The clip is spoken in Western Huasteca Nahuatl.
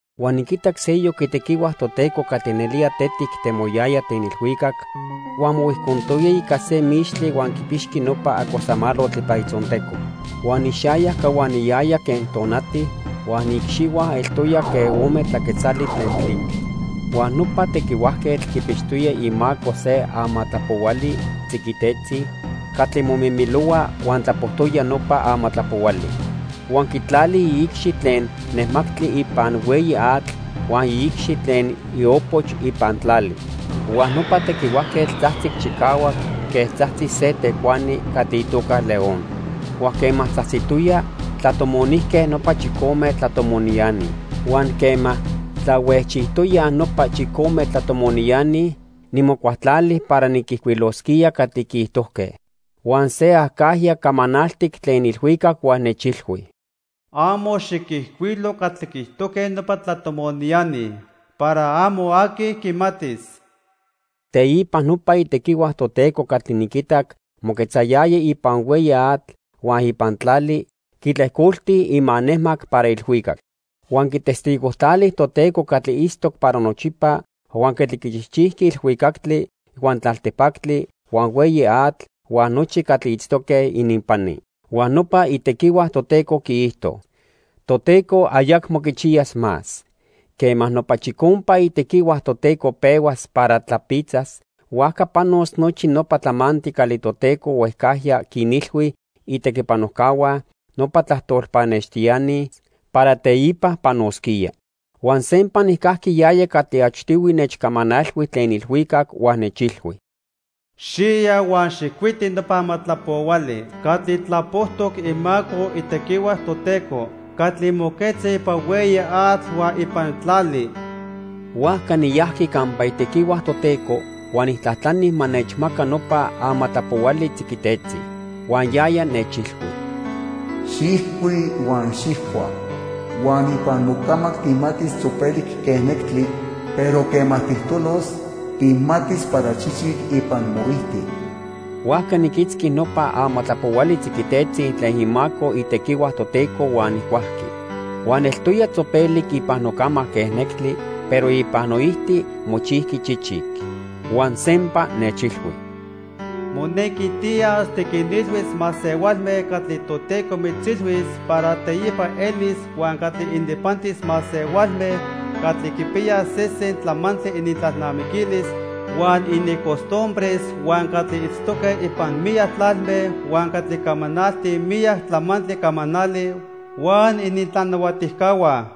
Huan niquitac seyoc itequihua Toteco catli nelía tetic temoyaya tlen ilhuicac, huan mohuijcontoya ica se mixtli huan quipixqui nopa acosamalotl ipan itzonteco. Huan ixayac cahuaniyaya quen tonati huan iicxihua eltoya quen ome tlaquetzali tlen tlitl. Huan nopa tequihuajquetl quipixtoya imaco se amatlapohuali tziquitetzi catli momimilohua huan tlapojtoya nopa amatlapohuali. Huan quitlali iicxi tlen nemactli ipan hueyi atl huan iicxi tlen iopoch ipan tlali. Huan nopa tequihuajquetl tzajtzic chicahuac quen tzajtzi se tecuani catli itoca león. Huan quema tzajtzitoya, tlatomonijque nopa chicome tlatomoniani. Huan quema tlahuejchijtoyaj nopa chicome tlatomoniani, nimocualtlali para niquijcuilosquía catli quiijtojque. Huan se acajya camanaltic tlen ilhuicac huan nechilhui: "Amo xiquijcuilo catli quiijtojque nopa tlatomoniani para amo aqui quimatis." Teipa nopa itequihua Toteco catli niquitac moquetzayaya ipan hueyi atl huan ipan tlali, quitlejcolti imanejmac para ilhuicac. Huan quitestigojtlali Toteco catli itztoc para nochipa huan catli quichijchijqui ilhuicactli, huan tlaltipactli, huan hueyi atl huan nochi catli itztoque ininpani. Huan nopa itequihua Toteco quiijto: "Toteco ayacmo quichiyas más. Quema nopa chicompa itequihua Toteco pehuas para tlapitzas, huajca panos nochi nopa tlamantli catli Toteco huejcajya quinilhui itequipanojcahua, nopa tlajtol pannextiani, para teipa panosquía." Huan sempa nijcajqui yaya catli achtihui nechcamanalhui tlen ilhuicac, huan nechilhui: "Xiya huan xijcuiti nopa amatlapohuali catli tlapojtoc imaco itequihua Toteco catli moquetza ipan hueyi atl huan ipan tlali." Huajca niyajqui campa itequihua Toteco huan nijtlajtlani ma nechmaca nopa amatlapohuali tziquitetzi. Huan yaya nechilhui: "Xijcui huan xijcua. Huan ipan mocamac tijmatis tzopelic quen nectli, pero quema tijtolos, tijmatis para chichic ipan moijti." Huajca niquitzqui nopa amatlapohuali tziquitetzi tlen imaco itequihua Toteco huan nijcuajqui. Huan eltoya tzopelic ipan nocamac quen nectli, pero ipan noijti mochijqui chichic. Huan sempa nechilhui: "Monequi tiyas tiquinilhuis masehualme catli Toteco mitzilhuis para teipa elis huan catli ininpantis masehualme catli quipiyaj sesen tlamantli inintlalnamiquilis huan inincostumbres, huan catli itztoque ipan miyac tlalme huan catli camanaltij miyac tlamantli camanali huan inintlanahuatijcahua."